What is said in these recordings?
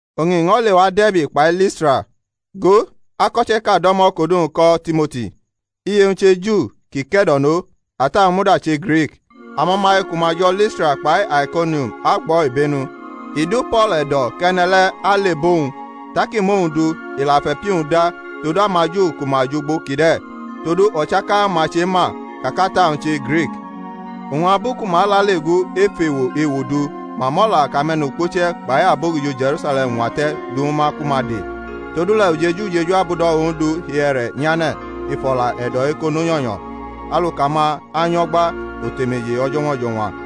Oñ i ño̩ lewa De̩rbi kpai Listra; go, ako̩che̩ʼka do̩mo̩ kʼodu-wñ ko̩ Timoti, iye-wñ che Ju ki ke̩do̩no, ata-wñ muda che Grik. Amo̩maye ku ma jo̩ Listra kpai Aikonium agbʼo̩ ibenu. I du Po̩l e̩do̩ kʼene̩ le̩ alebʼowñ; tak i mʼowñ du, i la fʼe̩pi-wñ da todu amaJu ku ma jʼugbo kide̩, todu o̩chaka ma chema ka kʼata-wñ che Grik. Oñ abu ku ma alale gu ef ewo ewo du ma mʼo̩la kʼame̩nukpuche̩ kpai abogijo Je̩rusale̩m ñwate̩ du ñwu ma ku ma de. Todule̩ ujeju ujeju abudo̩ Ondu hi e̩re̩ nyane̩ ef o̩la e̩do̩ ekono nyo̩nyo̩, aluka-ma anyo̩gba otemeje o̩jo̩ñwa o̩jo̩ñwa.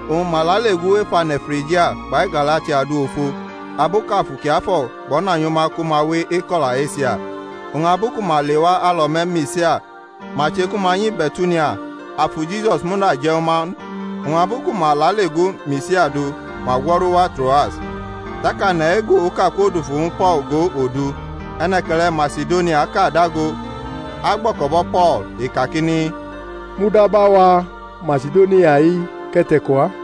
Oñ ma lale gu ef ane̩ Frigia kpai Galatia du ofo, abu kʼAfu Kiafo̩ kpo̩nanyʼuma ku ma we eko̩la Esia; oñ abu ku ma lewa alo̩me̩ Misia, ma che ku ma nyi Be̩tunia; Afu Jisus muda je̩ ñw uma n; oñ abu ku ma lale gu Misia du ma gwo̩ru wa Troas. Tak ane̩ ego oka kwodufu ñwu Po̩l go odu: e̩ne̩ke̩le̩ Masidoniaʼka dago agbo̩ko̩bo̩ Po̩l, i kakini, mudaba wa Masidonia-i kʼe̩ te̩ko wa.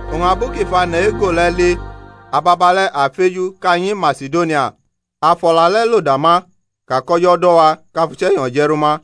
Oñ abu kʼi fʼane̩ ego le̩ li, ababale̩ a feju kʼa nyi Masidonia, a fʼo̩la le̩ lo dama ka kʼO̩jo̩ do̩ wa kʼa fʼUche̩nyo̩ je̩r uma.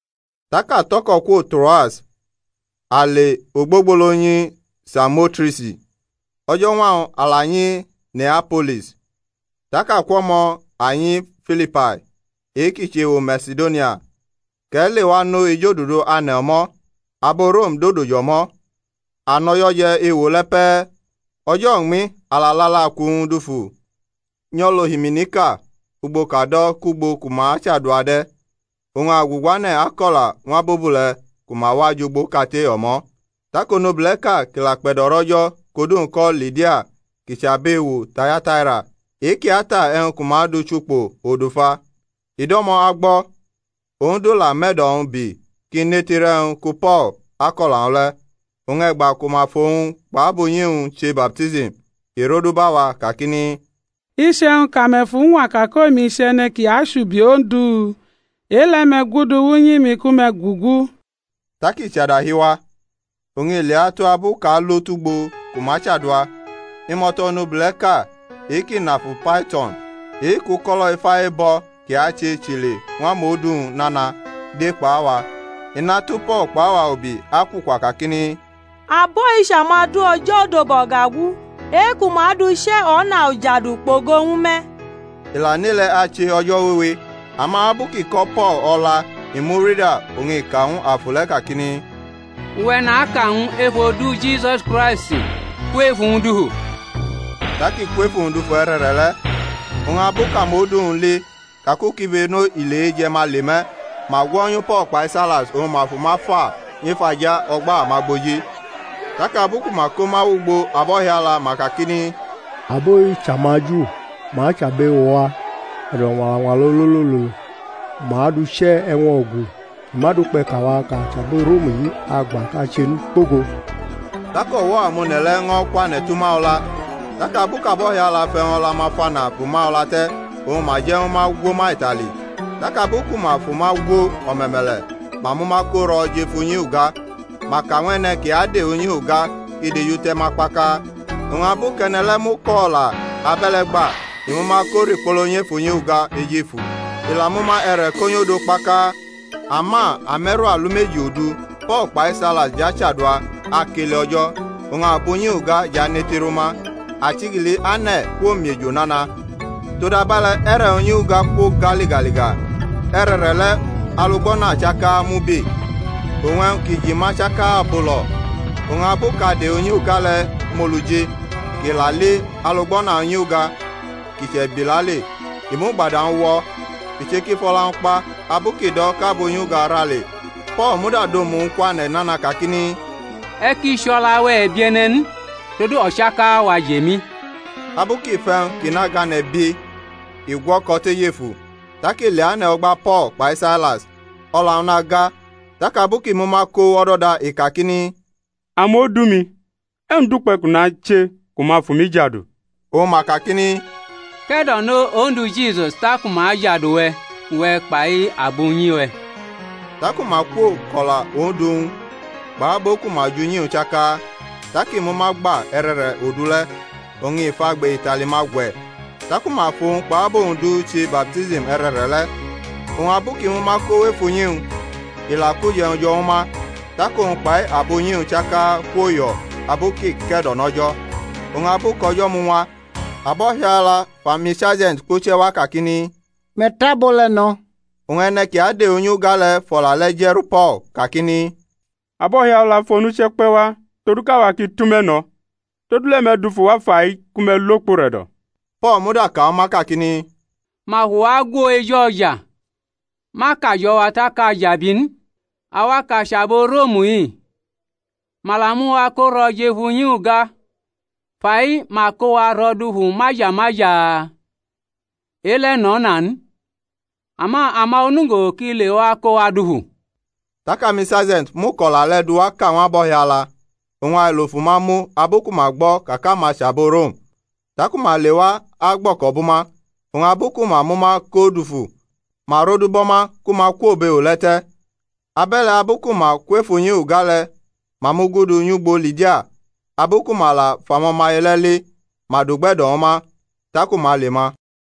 Tak a tʼo̩ko̩ kwo Troas, a le ogbogbolo nyi Samotresi, o̩jo̩ñwa-wñ a la nyi Neapolis, tak akwʼo̩mo̩ a nyi Filipai, e-kʼi chʼewo Masidonia kʼe̩ lewa nʼo ejodudu ane̩ o̩mo̩, abo Rom dodo jʼo̩mo̩. A nʼo̩jo̩ je̩ ewo le̩ pe̩e̩. O̩jo̩ uñmi a la lʼalaku-wñ dufu nyʼo̩lʼohiminiʼka ugbo kʼa do̩ kʼugbo ku ma chadua de̩; oñ a guguane̩ ako̩la ñw abobule̩ ku ma wa jʼugbo kate o̩mo̩. Tak onobule̩ʼka kʼi la kpe̩do̩rʼO̩jo̩ kʼodu-wñ ko̩ Lidia kʼi chʼabʼewo Tayataira e-kʼi ata e̩wñ ku ma du chʼukpo odufa, i do̩mo̩ agbo̩. Ondu la mʼe̩do̩-wñ bi kʼi netirʼe̩wñ ku Po̩l akʼo̩la-wñ le̩. Oñ e̩gba ku ma fʼowñ kpʼabunyi-wñ che baptism i rodubʼawa kakini, Iche̩wñ kʼame̩ fuñwa ka kʼomi chʼe̩ne̩ ki achubi Ondu, e-le̩ me̩ gudu wʼnyi-mi ku me̩ gugu. Tak i chʼadahi wa. Oñ i leatu abu kʼa alo tʼugbo ku ma chadua, imo̩to̩ onobule̩ʼka e-kʼi nʼafu Paito̩n, e-kʼuko̩lo̩ ifa ebo̩ ki ache chʼile ñw amodu-wñ nana, de kpʼawa. I natu Po̩l kpʼawa ubi akwukwa kakini, Abo-i chʼamudu O̩jo̩ Odobao̩gagu, e-ku ma dʼuche̩ o̩na ujadu kpogo ñw me̩. I la nʼe-le̩ ache o̩jo̩ wewe. Ama abu ki ko̩ Po̩l o̩la i mu-nda oñ i ka ñw afu le̩ kakini, Uwe̩ naka ñw u ef odu Jisusi Kraisti: kwʼef uwñ dufu. Tak i kwʼef uwñ dufu e̩re̩re̩ le̩. Oñ abu kʼamodu-wñ li ka kʼukibeno ile eje̩-ma le me̩, ma gwonyu Po̩l kpai Sailas oñ ma fʼuma fa nyʼef aja o̩gba amagboji. Tak abu ku ma ko ma wʼugbo abo̩hiala, ma kakini, Abo-i chʼamaJu, ma chʼabʼewo-wa e̩do̩ñwañwala ololololo. Ma dʼuche̩ e̩wñ o̩gu ki ma dukpe̩ kʼawa kʼa chʼabo Rom-i agba kʼa che n, kpogo. Tak o̩wo̩ amone̩ le̩ ño̩ kwane̩ tʼuma o̩la, tak abu kʼabohiala fʼe̩wñ o̩la-ma fana bʼuma o̩la te̩ oñ ma je̩ ñw ma gwo ma itali. Tak abu ku ma fʼuma gwo o̩me̩me̩le̩ ma mʼuma ko ro̩ jʼef unyi uga, ma ka ñw e̩ne̩ ki ade unyi uga kʼi dejute̩ ma kpaka. Oñ abu kʼe̩ne̩ le̩ mʼuko̩ o̩la abe̩le̩ gba, i mʼuma ko rikpolo nyef unyi uga ejefu, i la mʼuma e̩re̩ ko nyʼodo kpaka. Ama ame̩ru alumeji odu Po̩l kpai Sailas jʼachadua, akele O̩jo̩, oñ abunyi uga jʼanetirʼuma; achigili ane̩ kwomiejo nana, todabe̩le̩ e̩re̩ unyi uga kwoga ligaliga, e̩re̩re̩le̩ alugbo̩na chaka mubi, oñ e̩wñ ki ji ma chaka bulo̩. Oñ abu kʼade unyi uga le̩ mʼolu ji, kʼi la li alugbo̩na unyi uga ki che̩bi lale, i mʼugbada-wñ wo̩, i che kʼi fʼo̩la-wñ kpa abu kʼi do̩ kʼabunyuga ra le. Po̩l muda dʼomu-wñ kwane̩ nana, kakini, E̩ ki chʼo̩la-we̩ e̩bie̩ne̩ n; todu o̩chaka-wa jʼemi. Abu kʼi fʼe̩wñ kʼi nʼagane̩ bi i gwo̩ko̩ tʼejefu, tak i leane̩ o̩gba Po̩l kpai Sailas, o̩la-wñ naga. Tak abu kʼi mʼuma ko wʼo̩do̩da i kakini, Amodu-mi, e̩wñ dukpe̩ kʼu nache ku ma fʼumi jadu? Oñ ma kakini, Ke̩do̩no Ondu Jisus taku ma ajadu uwe̩, uwe̩ kpai abunyi-we̩. Taku ma kwo kʼo̩la Ondu ñw u, kpʼabo ku ma jʼunyi-wñ chaka. Tak i mʼuma gba e̩re̩re̩ odu le̩, oñ i fʼagbe itali-ma gwe̩; taku ma fʼowñ kpʼabo-wñ du che baptism e̩re̩re̩le̩. Oñ abu kʼi mʼuma ko wʼef unyi-wñ, i la kʼuje̩wñ jo̩ ñw uma, tak owñ kpai abunyi-wñ chaka kwoyo̩ abu kʼi ke̩do̩nʼO̩jo̩. Oñ abu kʼo̩jo̩ muñwa, abo̩hiala fʼamisarje̩nt kpuche̩ wa kakini, Me̩ tʼabo le̩ no̩. Oñ e̩ne̩ ki ade unyi uga le̩ fʼo̩la le̩ je̩ru Po̩l, kakini, Abo̩hiala fʼonuche̩ kpe̩ wa todu kʼawa ki tʼume̩ ño̩. Todule̩ me̩ dufu wa fai ku me̩ lo kpʼure̩do̩. Po̩l muda ka ñw uma kakini, Ma fʼuwa gwo eju o̩ja, ma kajo̩ wa tak a jʼabi n, awa kʼa chʼabo Rom-i, ma la mʼuwa koro̩ jʼef unyi uga; fai ma ko wa ro̩ dufu maja, maja? E-le̩ nʼo̩na n; ama ama onugo ki lewa ko wa dufu. Tak amisarje̩nt mʼuko̩la le̩ duwaka ñw abohiala. Oñ ailo fʼuma mu abu ku ma gbo̩ ka kʼama chʼabo Rom; Tak uma lewa agbo̩ko̩ bʼuma, oñ abu ku ma mʼuma ko dufu, ma rodubo̩ ma ku ma kwo bʼewo le̩ te̩. Abe̩le̩ abu ku ma kwʼef unyi uga le̩ ma mugudu nyʼugbo Lidia: abu ku ma la fʼamo̩maye le̩ li ma dʼugbe̩do̩ ñw uma, taku ma le ma.